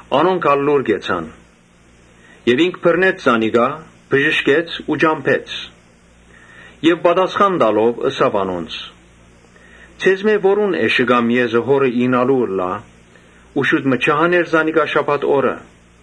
Անոնք լուռ կեցան։ Ինք բռնեց զանիկա, բժշկեց ու ճամբեց. Եւ դառնալով՝ ըսաւ անոնց. «Ձեզմէ որո՞ւն էշը կամ եզը եթէ հորը իյնայ, չի հաներ զանիկա շաբաթ օրը»։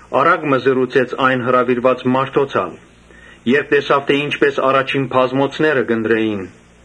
Առակ մը ըսաւ հրաւիրուած մարդոց ալ, երբ տեսաւ թէ ի՛նչպէս առաջին բազմոցները կ’ընտրէին.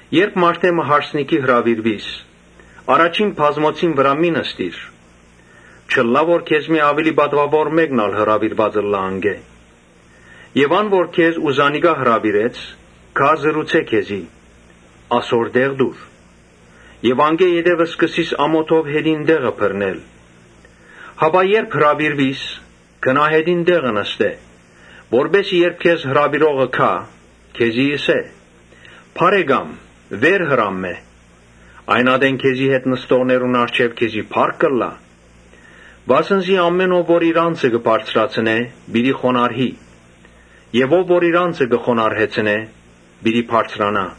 «Երբ մարդէ մը հարսանիքի հրաւիրուիս, առաջին բազմոցին վրայ մի՛ նստիր. չըլլայ թէ քեզմէ աւելի պատուաւոր մէկն ալ հրաւիրուած ըլլայ անկէ, Եւ ան որ քեզ ու զանիկա հրաւիրեց, գայ ու ըսէ քեզի. ‘Ասոր տեղ տուր’ եւ անկէ յետոյ սկսիս ամօթով յետին տեղը բռնել։ Հապա երբ հրաւիրուիս, գնա յետին տեղը նստէ. որպէս զի երբ քեզ հրաւիրողը գայ, քեզի ըսէ. ‘Բա՛րեկամ, վեր հրամմէ’. այն ատեն քեզի հետ նստողներուն առջեւ քեզի փառք կ’ըլլայ։ Վասն զի ամէն ով որ իր անձը կը բարձրացնէ, պիտի խոնարհի եւ ով որ իր անձը կը խոնարհեցնէ, պիտի բարձրանայ»։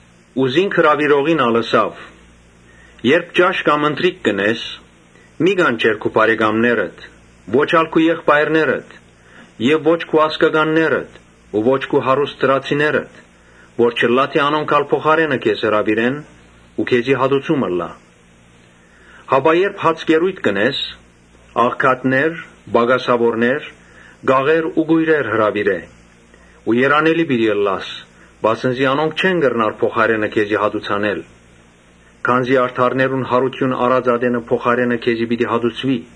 Զինք հրաւիրողին ալ ըսաւ. «Երբ ճաշ կամ ընթրիք կ’ընես, մի՛ կանչեր քու բարեկամներդ, ո՛չ ալ քու եղբայրներդ եւ ո՛չ քու ազգականներդ, ո՛չ քու հարուստ դրացիներդ, որ չըլլայ թէ անոնք ալ փոխարէնը քեզ հրաւիրեն ու քեզի հատուցում ըլլայ։ Հապա երբ հացկերոյթ կ’ընես՝ աղքատներ, պակասաւորներ, կաղեր ու կոյրեր հրաւիրէ Ու երանելի պիտի ըլլաս, վասն զի անոնք չեն կրնար փոխարէնը քեզի հատուցանել. քանզի արդարներուն յարութիւն առած ատենը փոխարէնը քեզի պիտի հատուցուի»։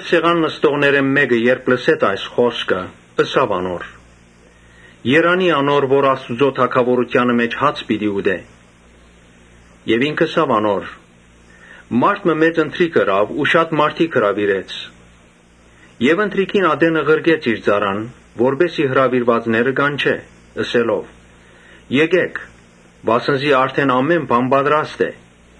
Սեղան նստողներէն մէկը, երբ լսեց այս խօսքը, ըսաւ անոր. «Երանի՜ անոր, որ Աստուծոյ թագաւորութեանը մէջ հաց պիտի ուտէ»։ Ինք ըսաւ անոր. «Մարդ մը մեծ ընթրիք մը պատրաստեց ու շատ մարդիկ հրաւիրեց։ Որոշուած ատենը ղրկեց իր ծառան, որպէս զի հրաւիրեալները կանչէ. «Եկէ՛ք, վասն զի արդէն ամէն բան պատրաստ է»։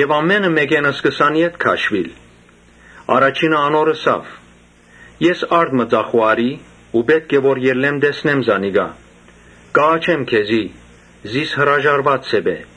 Ամէնքը սկսան ետ քաշուիլ։ Առաջինը անոր ըսաւ. «Ես արտ մը ծախու առի ու պէտք է որ ելլեմ տեսնեմ զանիկա. կ’աղաչեմ քեզի, զիս հրաժարուած սեպէ»։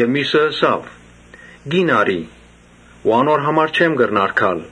Միւսը ըսաւ. «Կին առի, անոր համար չեմ կրնար գալ»։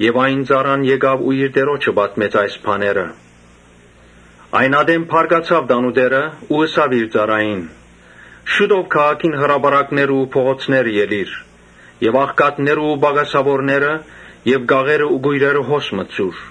Ծառան եկաւ ու իր տիրոջը պատմեց անոնց ըսածները։ Այն ատեն բարկացաւ տանտէրը ու ըսաւ իր ծառային. «Շուտով քաղաքին հրապարակները ու փողոցները ելի՛ր եւ աղքատներն ու պակասաւորները եւ կաղերն ու կոյրերը հոս մտցուր»։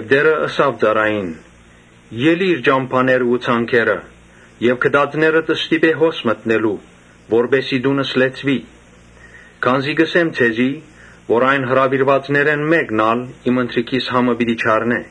Տէրը ըսաւ ծառային. «Ելի՛ր, ճամբաներն ու ցանկերը եւ գտածներդ ստիպէ որ հոս մտնեն, որպէս զի տունս լեցուի։ Քանզի կ’ըսեմ ձեզի, այն հրաւիրուածներէն մէկն ալ իմ ընթրիքիս համը պիտի չառնէ»։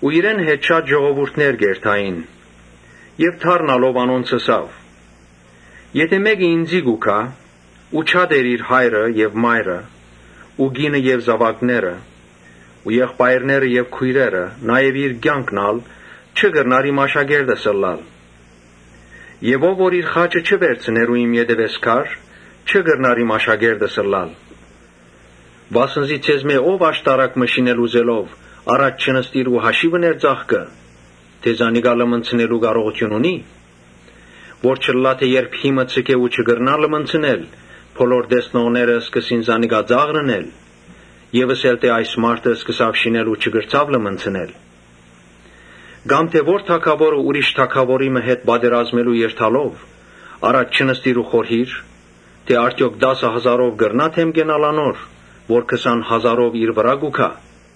Իրեն հետ շատ ժողովուրդ կ’երթային եւ դառնալով անոնց՝ ըսաւ. «Եթէ մէկը ինծի գայ, բայց չատէ իր հայրը եւ մայրը ու կինը եւ զաւակները ու եղբայրները եւ քոյրերը, նաեւ իր կեանքն ալ, չի կրնար իմ աշակերտս ըլլալ։ Ով որ իր խաչը չի վերցներ ու իմ ետեւէս գար, չի կրնար իմ աշակերտս ըլլալ։ Վասն զի ձեզմէ ո՞վ եթէ աշտարակ մը շինել ուզէ, առաջ չի նստիր ու հաշիւ ըներ ծախքը, ճշդելու համար թէ զանիկա լմնցնելու կարողութիւն ունի՞. Որ չըլլայ թէ երբ հիմը ձգէ ու չկրնայ լմնցնել, բոլոր տեսնողները սկսին զինք ծաղրել Եւ ըսել թէ ‘Այս մարդը սկսաւ շինել ու չկրցաւ լմնցնել’։ Կամ թէ ո՞ր թագաւորը ուրիշ թագաւորի մը հետ պատերազմելու երթալէ առաջ չի նստիր ու խորհիր, թէ արդեօք տասը հազարով կրնա՞յ դէմ կենալ անոր՝ որ քսան հազարով իր վրայ կու գայ։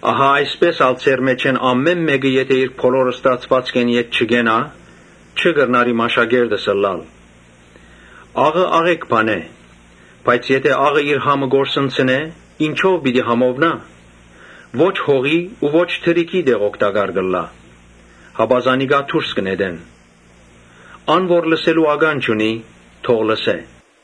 Ահա այսպէս ալ ձեր մէջէն ամէն մէկը եթէ իր բոլոր ստացուածքէն ետ չկենայ, չի կրնար իմ աշակերտս ըլլալ»։ «Աղը աղէկ բան է. բայց եթէ իր համը կորսնցնէ, ինչո՞վ պիտի համովնայ։ Ո՛չ հողի ու ո՛չ թրիքի տեղ օգտակար կ’ըլլայ, հապա զանիկա դուրս կը նետեն։ Ան որ լսելու ականջ ունի՝ թող լսէ»։